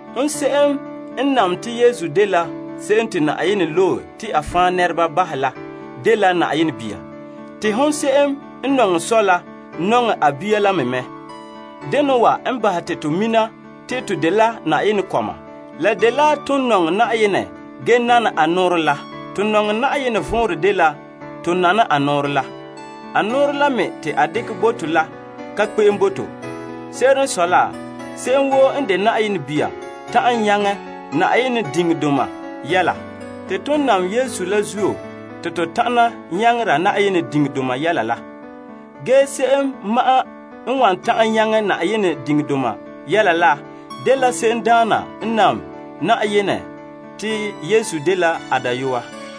Hon se'em n nam te Yesu dela se'em te Yenɛ loe la dela Yenɛ bia. Te hon se'em n nɔŋɛ Sɔ' la, nɔŋɛ a bia la me mɛ. Sɛla n bahɛ te to mina te to nɔŋɛ Yenɛ kɔma, dela tomam nɔŋɛ Yenɛ ge nana a nɔɔrɛ la. To nɔŋɛ Yenɛ vɔnrɛ dela to nana a nɔɔrɛ la. A nɔɔrɛ la me te a dekɛ bo to la ka kpe'em bo to. Se'ere n sɔe la, se'em woo n de Yenɛ bia ta'an nyaŋɛ teŋa wa zuo yɛla. Te ton nam Yesu la zuo te to tana nyaŋera teŋa wa zuo yɛla la. Ge se'em ma'an n wan ta'an nyaŋɛ teŋa zuo yɛla la, dela se'emdaana n nam Yenɛ te Yesu dela a dayɔa.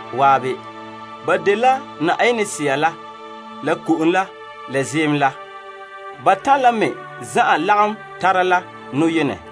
ge ba dela Yenɛ Sea la ko'om la ziim la. Batan' la me zan'an dela boyena.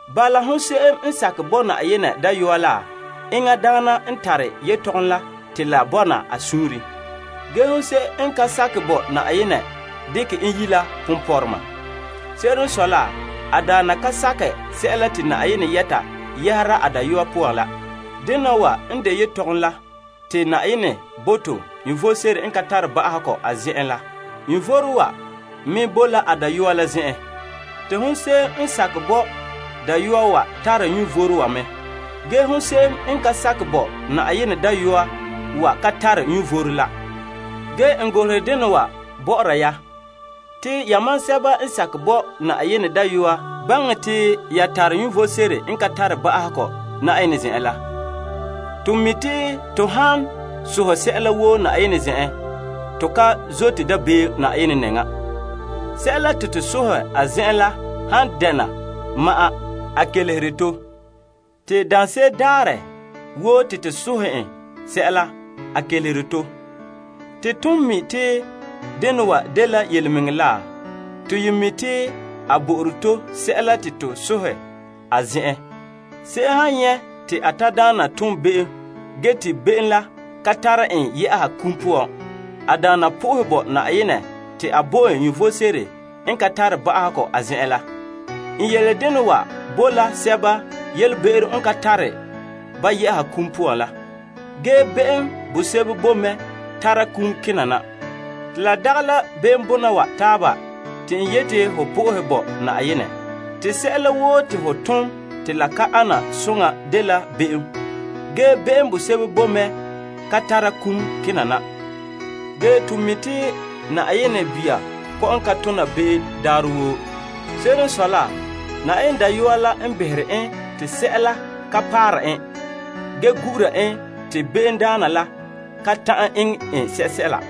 Bala, se'em woo n sakɛ bo Yenɛ Dayɔa la, tare yelehom bona wa mɛ ba suunre. Ge hon se'em n ka sakɛ bo Yenɛ dekɛ en yi' la ponpɔrɔma. Se'ere n sɔe la, a daana ka sakɛ sɛla te Yenɛ yɛta yɛhera a Dayɔa poan la. Yelehom la dela Na'ayenɛ bo to vom sebo n ka tare ba'ahegɔ. Vom wa me boe la a Dayɔa la zen'en. Te hon se'em n sakɛ bo Dayɔa wa tare vom wa mɛ. Ge hon se'em n ka sakɛ bo Yenɛ Dayɔa wa ka tare vom la. Ge n golehere dena wa bɔ'ɔra ya. Te yamam sɛba n sakɛ bo Yenɛ Dayɔa baŋɛ te ya tare vom sebo n ka tare ba'ahegɔ Na'ayenɛ zen'en la. To mi' te to han sohɛ sɛla woo a zen'en, to ka zote dabeem a nɛŋa. Sɛla te to sohɛ la han dɛna a sunboolom, a kelehere to. Te daanse'ere daarɛ woo te to sohɛ en sɛla, a kelehere to. Te ton mi' te dena wa dela yelemɛŋɛrɛ la, to mi' te a bo'ore to sɛla te to sohɛ a zen'en. Se'em han nyɛ' te a tadaana tom be'em ge te be'em la ka tare en yɛ'a kum poan, a daana sohɛ bo Yenɛ te a bo en vom sebo n ka tare ba'ahegɔ a zen'en la. N yele dena wa bo la sɛba yelebe'ero n ka tare ba yɛ'a kum poan la. Ge be'em bosebo bo mɛ tara kum kena na. Te la dagɛ la be'em bɔna wa taaba te n yeti ho sohɛ bo Na'ayenɛ. Te sɛla woo te ho tom te la ka ana soŋa dela be'em. Ge be'em bosebo bo mɛ ka tara kum kena na. Ge to mi' te Yenɛ kɔma kɔ'ɔn ka tona be'em daarɛ woo. Se'ere n sɔe la, Yenɛ Dayɔa la n behere ba te sɛla ka paara ba ge gura ba te be'emdaana la kan ta'an eŋɛ ba sɛla.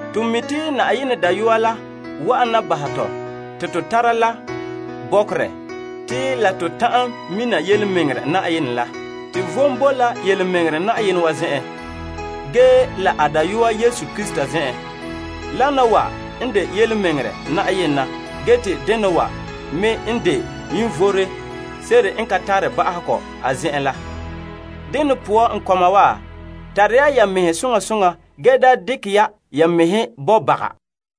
To mi' te Yenɛ Dayɔa la wa'ana bo to bɔkerɛ, te la to ta'an mina yelemɛŋɛrɛ Yenɛ la. Tomam boe me la yelemɛŋɛrɛ Yenɛ la a dayɔa Yesu Krista. Yenɛ dena wa n de yelemɛŋɛrɛdaana, te vom bona dɛna vom sebo n ka tare ba'ahegɔ la. Dene poan n kɔma wa, tara ya ya mɛhe soŋa soŋa, ge da dekɛ ya ya mɛhe bo baga.